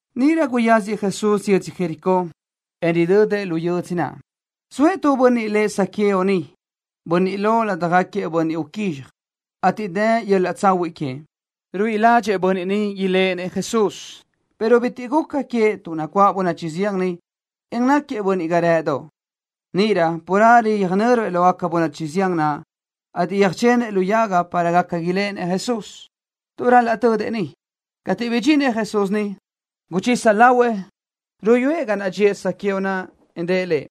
Níʼirö guyáziëʼ Jesús yödzö Jericó, en ridödëʼ lu yödzö naʼ. Zoëʼ tu bönniʼ lëʼ Zaqueo niʼ, bönniʼ lo ládjagaquiëʼ bönniʼ uquízxaj, ateʼ dë yöl-laʼ tsahuiʼ queëʼ. Ruíʼi ládxëʼë bönniʼ ni iléʼenëʼ Jesús, pero bitiʼ guca queëʼ tuʼ nacuáʼ bönachi zián niʼ, en náquiëʼ bönniʼ ga rë́ʼëdoʼ. Níʼirö carelö yöjnö́ruëʼ lógaca bönachi zián naʼ, ateʼ yöjchenëʼ tu lu yaga para gaca iléʼenëʼ Jesús, tuʼ ral-laʼ tödëʼ niʼ. Cateʼ bidxinëʼ Jesús niʼ, guchisa lahuëʼ ruyúëʼ ga naʼ dxíëʼ Zaqueo naʼ, en rëʼ lëʼ: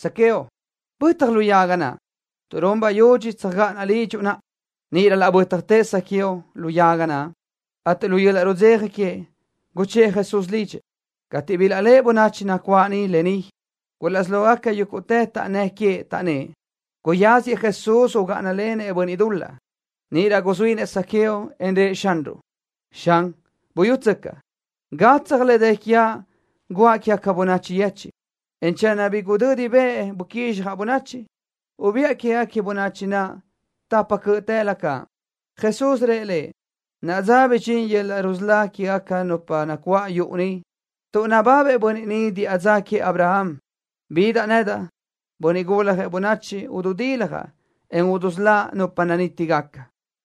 —Zaqueo, bö́tjatë lu yaga naʼ, tuʼ run bayudxi tsöjgáʼanaʼ lidxuʼ naʼa. Níʼirö laʼ bö́tjatëʼ Zaqueo lu yaga, ateʼ lu yöl-laʼ rudzeja queëʼ guchë́ʼë Jesús lidxëʼ. Cateʼ bilaʼléʼe bönachi nacuáʼ niʼ lë ni, gulaʼsí lógaquiëʼ yúguʼtëʼ taʼnnë́ʼ queëʼ, taʼnnë́ʼ: —Guyáziëʼ Jesús ugáʼanalenëʼ bönniʼ dul-laʼ. Níʼirö guzuínëʼ Zaqueo, en rëʼ Xanruʼ: —Xan, buyútsöcaʼ. Gatsaj le dë quiaʼ guʼa quégaca bönachi yechiʼ, en channö bi gudödi bëʼ buquizxjaʼ bönachi, ubiʼa quégaca bönachi naʼ tapa cö́ʼtëlö caʼ. Jesús rëʼ lëʼ: —Naʼa dza ni bidxín yöl-laʼ rusölá quégaca nupa nacuáʼ yuʼu ni, tuʼ nababëʼ bönniʼ ni diʼa dza queëʼ Abraham. Bidaʼ nedaʼ, Bönniʼ Guljëʼ Bönachi, ududiljaʼ, en udusöláʼ nupa nanítigaca.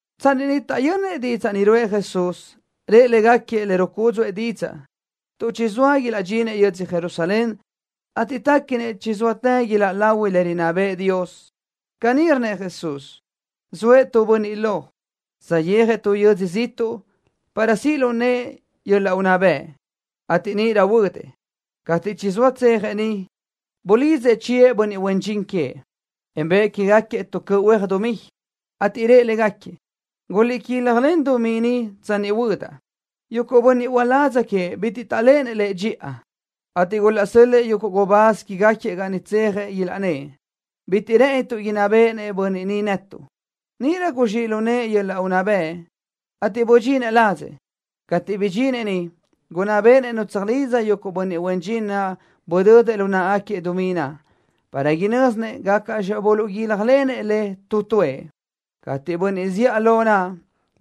Tsanni niʼ taʼyönnëʼ didzaʼ ni ruʼë Jesús, rëʼ légaquiëʼ le rucúdzuʼë didzaʼ, tuʼ chizóa ilaʼdxinëʼ yödzö Jerusalén, ateʼ téquinëʼ chizóatë iláʼ lahui le rinná bëʼë Dios. Caní rnnëʼ Jesús: —Zoëʼ tu bönniʼ lo, saʼyéajëʼ tu yödzö ziʼtuʼ para siʼ lu nëʼë yöl-laʼ unná bëʼ, ateʼ níʼirö huödëʼ. Cateʼ chizóa tsejëʼ niʼ bulidzëʼ chiëʼ bönniʼ huen dxin queëʼ, en bëʼë que queë́gaquiëʼ tu cöʼ huéaj dumí, ateʼ rëʼ légaquiëʼ: “Guliʼguílajlen dumí ni tsanni huödaʼ.” Yuguʼ bönniʼ uládz queëʼ bitiʼ taʼléʼenëʼ lëʼ dxiʼa, ateʼ gulaʼsö́l-lëʼë yuguʼ gubáz quégaquiëʼ ga niʼ tsejëʼ, ilaʼnnë́ʼ: “Bitiʼ rë́ʼënituʼ inná béʼenëʼ bönniʼ ni netuʼ.” Níʼirö guzxíʼ lu nëʼë yöl-laʼ unná bëʼ, ateʼ budxinëʼ ladzëʼ. Cateʼ bidxinëʼ niʼ gunná béʼenëʼ nu tsöjlidza yuguʼ bönniʼ huen dxin naʼ budödëʼ lu náʼagaquiëʼ dumí naʼ, para inö́zinëʼ gácaʼxi buluʼguílajlenëʼ le tu tuëʼ. Cateʼ bönniʼ zíʼalö naʼ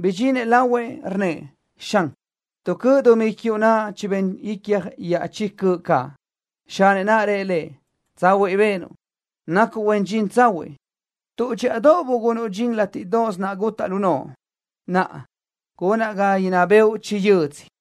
bidxinëʼ lahuëʼ, rnnëʼ: “Xan, tu cöʼ dumí quiuʼ naʼ chibén icja iaʼchí cöʼ caʼ.” Xanëʼ naʼ rëʼ lëʼ: “Tsahuiʼ benuʼ. Nacuʼ huen dxin tsahuiʼ. Tuʼ dxíʼadoʼ bugunuʼ dxin látiʼdoʼos naʼ gutaʼ lu noʼo, naʼa, gunaʼ ga inná béʼenuʼ chi yödzö.”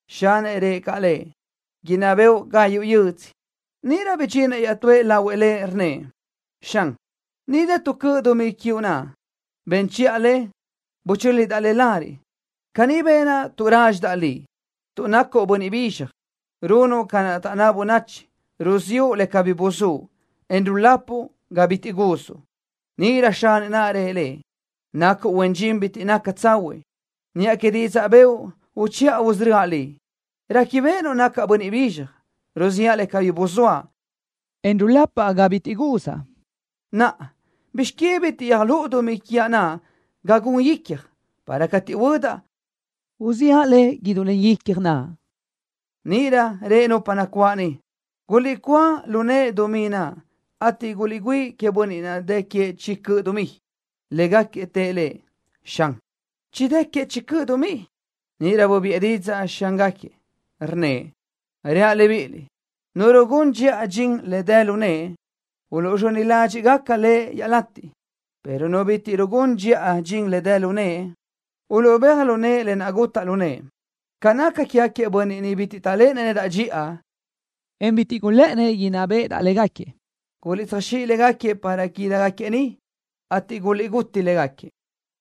Xanëʼ naʼ rëʼ caʼ lëʼ: “Inná béʼenuʼ gayuʼ yödzö.” Níʼirö bidxinëʼ iaʼtúëʼ lahuëʼ lëʼ, rnnëʼ: “Xan, ni dë tu cöʼ dumí quiuʼ naʼ. Ben chiʼa le, butúlidaʼ le lariʼ. Caní benaʼ tuʼ rádxidaʼ liʼ, tuʼ nacuʼ bönniʼ bizxaj. Runuʼ ca naʼ taʼnná bönachi: Ruziʼu le cabí buzúʼ, en rulapuʼ ga bitiʼ guzuʼ.” Níʼirö xanëʼ naʼ rëʼ lëʼ: “Nacuʼ huen dxin bitiʼ naca tsahuiʼ. Niʼa que didzaʼ bëʼu uchiʼa usörö́aʼ liʼ. ¿Réquibeʼenuʼ nacaʼ bönniʼ bizxaj: Ruziʼa le cabí buzóaʼ, en rulapaʼ ga bitiʼ guzaʼ? Naʼa, ¿bizx que bitiʼ yöjlúʼu dumí quiaʼ naʼ ga gun icja, para cateʼ huödaʼ, uziʼa le idú len icja naʼ?” Níʼirö rëʼ nupa nacuáʼ niʼ: “Guliʼcúa lu nëʼë dumí naʼ, ateʼ guliʼgüíʼi queëʼ bönniʼ naʼ dë queëʼ chi cöʼ dumí.” Légaquiëʼ tëʼ lëʼ: “Xan, chidë́ queëʼ chi cöʼ dumí.” Níʼirö bubiʼë didzaʼ xángaquiëʼ, rnnëʼ: “Reaʼ libíʼiliʼ: Nu rugún dxiʼa dxin le doʼ dë lu nëʼe, uluʼzxöni ládxiʼgaca lëʼ iaʼlateʼ, pero nu bitiʼ rugún dxiʼa dxin le doʼ dë lu nëʼe, uluʼbéaj lu nëʼe lë naʼ gutaʼ lu nëʼe. Ca naca quégaquiëʼ bönniʼ niʼ bitiʼ taʼléʼenëʼ nedaʼ dxiʼa, en bitiʼ gulë́ʼënnëʼ inná béʼedaʼ légaquiëʼ, guliʼtsöjzxíʼ légaquiëʼ para ídigaquiëʼ ni, ateʼ guliʼguti légaquiëʼ.”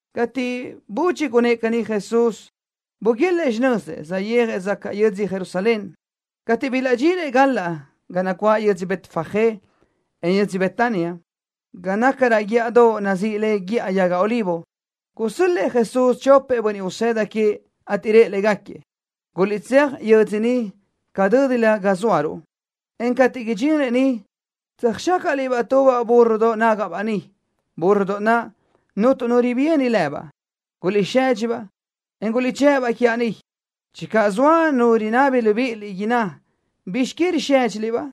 Cateʼ budxi gunnë́ʼ caní Jesús, buguélëʼë xinözëʼ, saʼyéajëʼ zacaʼ yödzö Jerusalén. Cateʼ bilaʼdxinëʼ galaʼ ga nacuáʼ yödzö Betfagé, en yödzö Betania, ga naca raʼ guíʼadoʼ nazíʼi le Guíʼa Yaga Olivo, gusö́l-lëʼë Jesús chopëʼ bönniʼ usëda queëʼ, ateʼ rëʼ légaquiëʼ: —Guliʼtséaj yö́dzödoʼ niʼ ca dö́dilö ga zóaruʼ, en cateʼ idxinliʼ niʼ, tsöjxácaʼliʼ-baʼ tubaʼ búrrodoʼ nágaʼbaʼ niʼ, búrrodoʼ naʼ cuntu nu ribíani lëbaʼ. Guliʼsedxi-baʼ, en guliʼduchë́ʼ-baʼ quiaʼ ni. Channö zoa nu rinábini libíʼiliʼ, inná: “¿Bizx que risédxiliʼ-baʼ?”,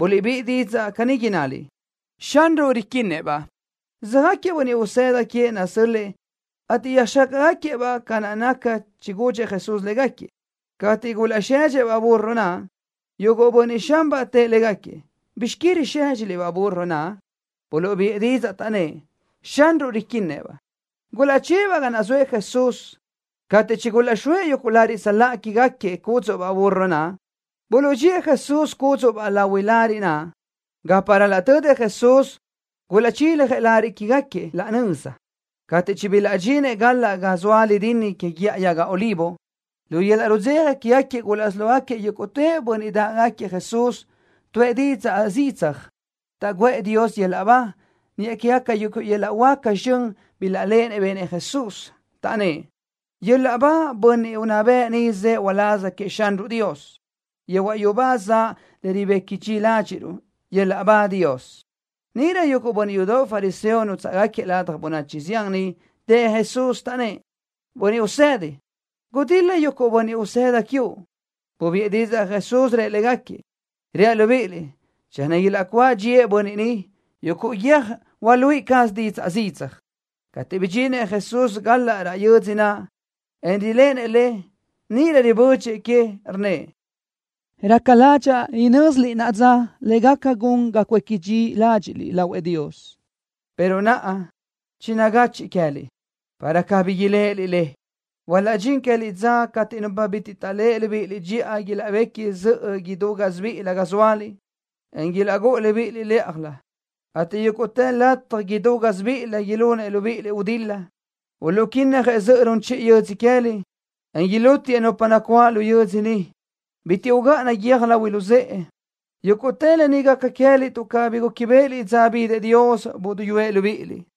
ubíʼiliʼ didzaʼ caní innaliʼ: “Xanruʼ riquinnëʼ-baʼ.” Söjáquiëʼ bönniʼ usëda queëʼ naʼ nasö́l-lëʼë, ateʼ yöjxácaʼgaquiëʼ-baʼ ca naʼ chigudxëʼ Jesús légaquiëʼ. Cateʼ gulaʼsedxëʼ-baʼ búrrodoʼ naʼ, yuguʼ bönniʼ xanbaʼ tëʼ légaquiëʼ: —¿Bizx que risédxiliʼ-baʼ búrrodoʼ naʼ? Buluʼbiʼë didzaʼ, taʼnnë́ʼ: —Xanruʼ riquinnëʼ-baʼ. Gulaʼchë́ʼë-baʼ ga naʼ zoëʼ Jesús. Cateʼ chigulaʼxóëʼ yuguʼ lariʼ tsöláʼa quégaquiëʼ cúdzuʼbaʼ búrrodoʼ naʼ, buluʼdxíëʼ Jesús cúdzuʼbaʼ lahui lariʼ naʼ. Gapa ral-laʼ tödëʼ Jesús, gulaʼchiljëʼ lariʼ quégaquiëʼ laʼ nöza. Cateʼ chibilaʼdxinëʼ galaʼ ga zoa lidinni que Guíʼa Yaga Olivo, lu yöl-laʼ rudzeja quégaquiëʼ gulaʼsí lógaquiëʼ yúguʼtë bönniʼ dáʼgaquiëʼ Jesús, tuʼë zidzaj didzaʼ, taʼguʼë Dios yöl-laʼ ba, niʼa quégaca yuguʼ yöl-laʼ huáca zxön bilaʼléʼenëʼ benëʼ Jesús. Taʼnnë́ʼ: —¡Yöl-laʼ ba bönniʼ unná bëʼ ni zëʼë uláz queëʼ Xanruʼ Dios! ¡Yehuaʼ yubá zaʼ le ribequi dxi ládxiʼruʼ! ¡Yöl-laʼ ba Dios! Níʼirö yuguʼ bönniʼ yudoʼ fariseo nútsaʼgaquiëʼ ladaj bönachi zián niʼ tëʼ Jesús, taʼnnë́ʼ: —¡Bönniʼ Usedi, gudil-la yuguʼ bönniʼ usëda quiuʼ! Bubiʼë didzaʼ Jesús, rëʼ légaquiëʼ: —Reaʼ libíʼiliʼ: Channö ilaʼcuáʼ dxíëʼ bönniʼ ni, yuguʼ guiö́j hualuíʼi caz zidzaj didzaʼ. Cateʼ bidxinëʼ Jesús galaʼ raʼ yödzö naʼ, en riléʼenëʼ le, níʼirö ribödxëʼ que, rnnëʼ: —Raca ládxaʼa huanö́ziliʼ naʼa dza le gaca gun ga cuéqui dxi ládxiʼliʼ lahuëʼ Dios, pero naʼa chinagachiʼ queë́liʼ, para cabí iléʼeliʼ le. Hualaʼdxín queë́liʼ dza cateʼ nupa bitiʼ taʼléʼe libíʼiliʼ dxiʼa ilaʼbequi zöʼö idú gásibiʼilö ga zóaliʼ, en ilaʼgúʼu libíʼiliʼ lë́ʼalö, ateʼ yúguʼtë lataj idú gásibiʼilö ilúnlenëʼ libíʼiliʼ gudil-la. Uluʼquínnajëʼ zöʼö run chiʼi yödzö queë́liʼ, en ilútiëʼ nupa nacuáʼ lu yödzö ni. Bitiʼ ugáʼana guiö́j lahui luzë́ʼe. Yúguʼtë lë ni gaca queë́liʼ tuʼ cabí gúquibeʼeliʼ dza bidëʼ Dios buduyúëʼ libíʼiliʼ.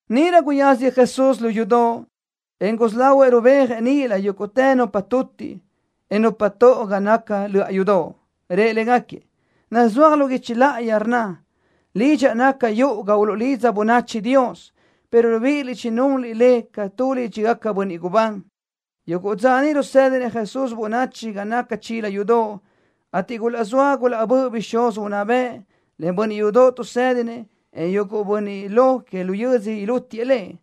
Níʼirö guyáziëʼ Jesús löʼa yudoʼ, en gusí lahuëʼ rubéajëʼ níʼilö yúguʼtë nupa tutiʼ, en nupa toʼo ga naca löʼa yudoʼ. Rëʼ légaquiëʼ: —Nazúaj lu guichi láʼayi, rnna: “Lidxaʼ naca yuʼu ga uluʼlidza bönachi Dios”, pero libíʼiliʼ chinunliʼ le ca tu lídxigaca bönniʼ gubán. Yuguʼ dza rusédinëʼ Jesús bönachi ga naca chila yudoʼ, ateʼ gulaʼzóa gulaʼböʼë bixúz unná bëʼ, len bönniʼ yudoʼ tuʼsédinëʼ, en yuguʼ bönniʼ lo que lu yödzö ilútiëʼ Lëʼ.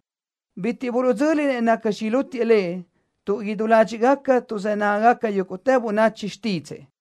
Bitiʼ buluʼdzö́linëʼ nacxi ilútiëʼ Lëʼ, tuʼ idú ládxiʼgaca tuʼzë́ nágagaca yúguʼtë bönachi xtídzëʼë.